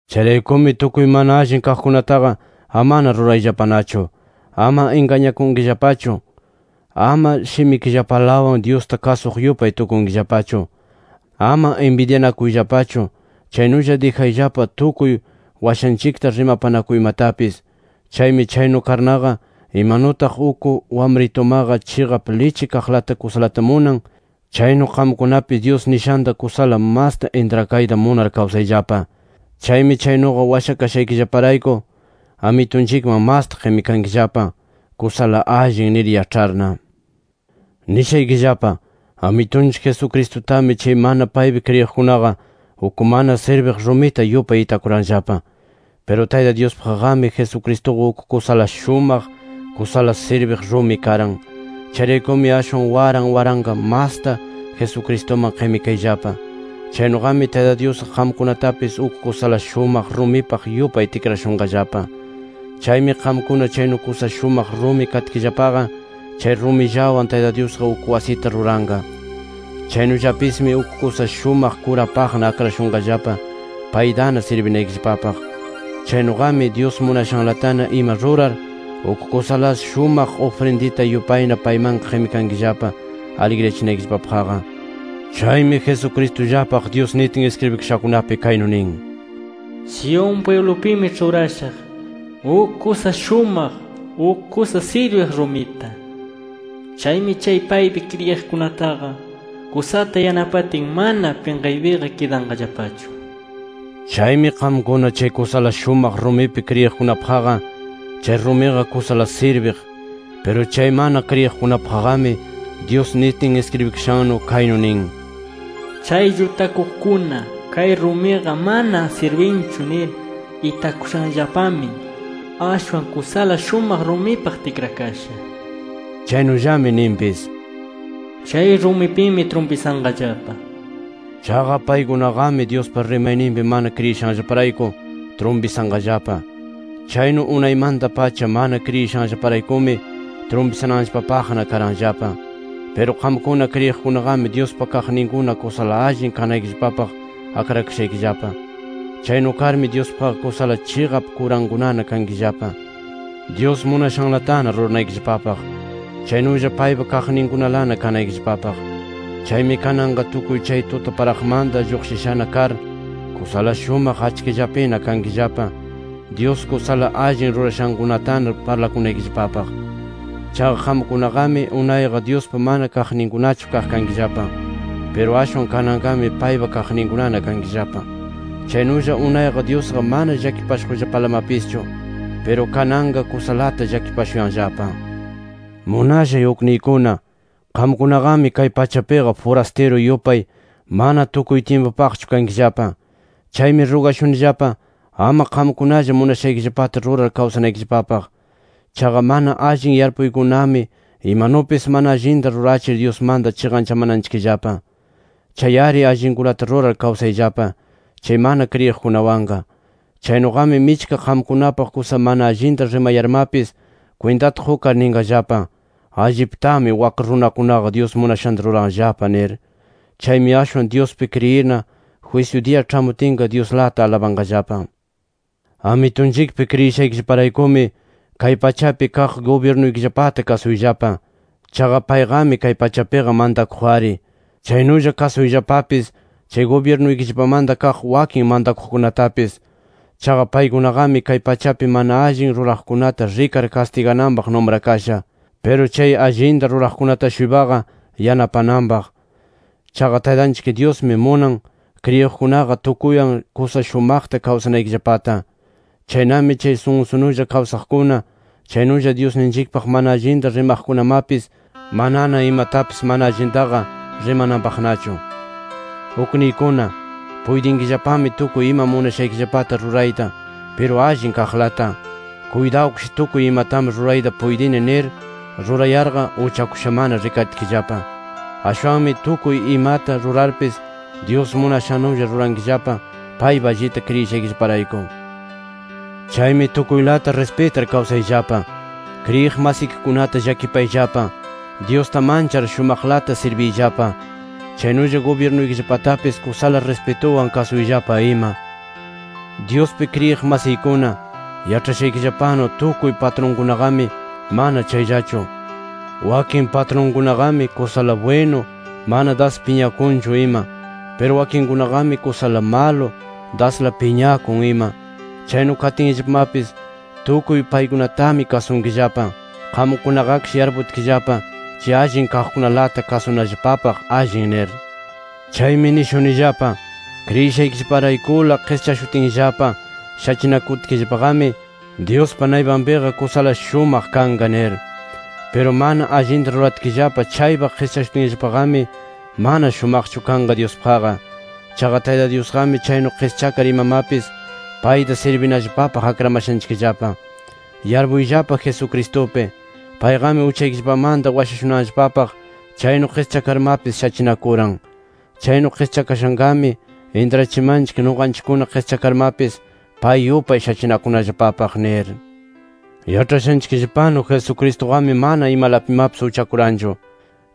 Chayraykumi tukuy mana allin kaqkunataqa amana rurayllapanachu. Ama ingañanakunkillapachu. Ama shimikillapalawan Dyusta kasuq yupay tukunkillapachu. Ama inbidyanakuyllapachu. Chaynulla dijayllapa tukuy washanchikta rimapanakuymatapis. Chaymi chaynu karnaqa, imanutaq uk wamritumaqa chiqap lichi kaqlata kusalata munan, chaynu qamkunapis Dyus nishanta kusala masta intrakayta munar kawsayllapa. Chaymi chaynuqa washakashaykillaparayku Amitunchikman masta qimikankillapa, “Kusala allin” nir yaĉharna. Nishaykillapa: Amitunchik Jesucristutami chay mana paypi kriyiqkunaqa, uk mana sirbiq rumita yupay itakuranllapa. Piru Tayta Dyuspaqqami, Jesucristuqa uk kusala shumaq, kusala sirbiq rumi karan. Chayraykumi ashwan waran waranqa masta, Jesucristuman qimikayllapa. Chaynuqami Tayta Dyusqa qamkunatapis uk kusala shumaq rumipaq yupay tikrashunqallapa. Chaymi qamkuna chaynu kusa shumaq rumi katkillapaqa, chay rumillawan Tayta Dyusqa uk wasita ruranqa. Chaynullapismi uk kusa shumaq kurapaqna akrashunqallapa paytana sirbinaykillapapaq. Chaynuqami, Dyus munashanlatana ima rurar, uk kusala shumaq ufrindita yupayna paymanqa qimikankillapa aligriyachinaykillapapaqqa. Chaymi Jesucristullapaq Dyus nitin iskribikashakunapi kaynu nin: “Sión pwiblupimi ĉhurashaq uk kusa shumaq, uk kusa sirbiq rumita. Chaymi chay paypi kriyiqkunataqa kusata yanapatin mana pinqaypiqa kidanqallapachu” nir. Chaymi qamkuna chay kusala shumaq rumipi kriyiqkunapaqqa, chay rumiqa kusala sirbiq. Piru chay mana kriyiqkunapaqqami, Dyus nitin iskribikashannu kaynu nin: “Chay llutakuqkuna kay rumiqa mana sirbinchu nir itakushanllapami, ashwan kusala shumaq rumipaq tikrakasha” nir. Chaynullami ninpis: “Chay rumipimi trumpisanqallapa” nir. Chaqa paykunaqami, Dyuspa rimayninpi mana kriyinashanllaparayku trumpisanqallapa. Chaynu unaymanta-pacha mana kriyinashanllaparaykumi trumpisananllapapaqna karanllapa. Piru qamkuna kriyiqkunaqami Dyuspa kaqninkuna kusala allin kanaykillapapaq akrakashaykillapa. Chaynu karmi Dyuspaqqa kusala chiqap kurankunana kankillapa, Dyus munashanlatana ruranaykillapapaq. Chaynulla paypa kaqninkunalana kanaykillapapaq. Chaymi kananqa tukuy chay tutaparaqmanta lluqshishana kar, kusala shumaq achkillapina kankillapa Dyus kusala allin rurashankunatana parlakunaykillapapaq. Chaqa qamkunaqami, unayqa Dyuspa mana kaqninkunachu kaq kankillapa. Piru ashwan kananqami paypa kaqninkunana kankillapa. Chaynulla unayqa Dyusqa mana llakipashuqllapalamapischu. Piru kananqa kusalata llakipashuyanllapa. Munashay ukniykuna, qamkunaqami kay pachapiqa furastiru yupay, mana tukuy tyimpupaqchu kankillapa. Chaymi rugashunillapa, ama qamkunalla munashaykillapata rurar kawsanaykillapapaq. Chaqa mana allin yarpuykunami, imanupis mana allinta rurachir, Dyusmanta chiqanchamananchikllapa. Chay-ari allinkunata rurar kawsayllapa, chay mana kriyiqkunawanqa. Chaynuqami michka qamkunapaq kusa mana allinta rimayarmapis, kwintata qukar ninqallapa: “Alliptami wak runakunaqa Dyus munashanta ruranllapa” nir. Chaymi ashwan Dyuspi kriyirna, jwisyu diya ĉhamutinqa Dyusta alabanqallapa. Amitunchikpi kriyishaykillaparaykumi, kay pachapi kaq gubyirnuykillapata kasuyllapa. Chaqa payqami kay pachapiqa mantakuq-ari. Chaynulla kasuyllapapis chay gubyirnuykillapamanta kaq wakin mantakuqkunatapis. Chaqa paykunaqami, kay pachapi mana allin ruraqkunata rikar kastigananpaq numrakasha. Piru chay allinta ruraqkunata-shuypaqa yanapananpaq. Chaqa Taytanchik Dyusmi munan, kriyiqkunaqa tukuywan kusa shumaqta kawsanaykillapata. Chaynami, chay sunsunulla kawsaqkuna, chaynulla Dyusninchikpaq mana allinta rimaqkunamapis, manana imatapis mana allintaqa rimananpaqnachu. Ukniykuna, puytinkillapami tukuy ima munashaykillapata rurayta, piru allin kaqlata. Kuytawkish “Tukuy imatami rurayta puytini” nir rurayarqa, uchakushamana rikaritkillapa. Ashwanmi tukuy imata rurarpis Dyus munashannulla rurankillapa paypi allita kriyishaykillaparayku. Chaymi tukuylata rispitar kawsayllapa. Kriyiq masikikunata llakipayllapa. Dyusta manchar shumaqlata sirbiyllapa. Chaynulla gubyirnuykillapatapis kusala rispituwan kasuyllapa ima. Dyuspi kriyiq masiykuna, yaĉhashanchikllapanu tukuy patrunkunaqami mana chayllachu. Wakin patrunkunaqami kusala bwinu, mana das piñakunchu ima. Piru wakinkunaqami, kusala malo, dasla piñakun ima. Chaynu katinllapamapis tukuy paykunatami kasunkillapa. Qamkunaqakish yarputkillapa chay allin kaqkunalata kasunallapapaq allin nir. Chaymi nishunillapa: Kriyishaykillaparaykula qischashutinllapa shachinakutkillapaqami, Dyuspa naypanpiqa kusala shumaq kanqa nir. Piru mana allinta ruratkillapa chaypaq qischashutinllapaqami, mana shumaqchu kanqa Dyuspaqqa. Chaqa Tayta Dyusqami, chaynu qischakar imamapis payta sirbinallapapaq akramashanchikllapa. Yarpuyllapa Jesucristupi, payqami uchaykillapamanta washashunanllapapaq chaynu qischakarmapis shachinakuran. Chaynu qischakashanqami intrachimanchik, nuqanchikkuna qischakarmapis, pay yupay shachinakunallapapaq nir. Yaĉhashanchikllapanu Jesucristuqami, mana imalapimapis uchakuranchu.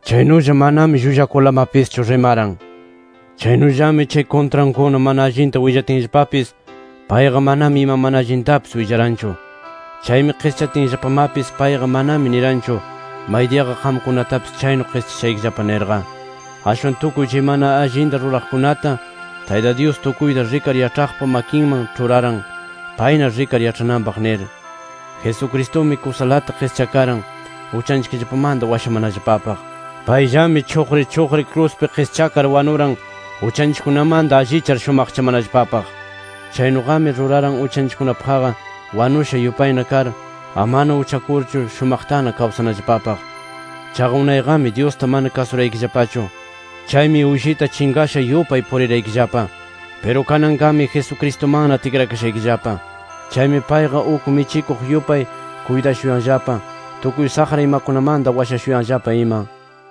Chaynulla manami llullakurlamapischu rimaran. Chaynullami chay kuntrankuna mana allinta willatinllapapis, payqa manami ima mana allintapis willaranchu. Chaymi qischatinllapamapis, payqa manami niranchu, maydiyaqa qamkunatapis chaynu qischashaykillapa nirqa. Ashwan tukuy chay mana allinta ruraqkunata, Tayta Dyus tukuyta rikar yaĉhaqpa makinman ĉhuraran payna rikar yaĉhananpaq nir. Jesucristumi kusalata qischakaran uchanchikllapamanta washamanallapapaq. Payllami chuqri chuqri kruspi qischakar wanuran uchanchikkunamanta allichar shumaqchamanallapapaq. Chaynuqami ruraran uchanchikkunapaqqa wanusha yupayna kar, amana uchakurchu shumaqtana kawsanallapapaq. Chaqa unayqami Dyusta mana kasuraykillapachu. Chaymi uyshita chinqasha yupay puriraykillapa. Piru kananqami Jesucristumanna tikrakashaykillapa. Chaymi payqa uk michikuq yupay kuytashuyanllapa, tukuy saqra imakunamanta washashuyanllapa ima.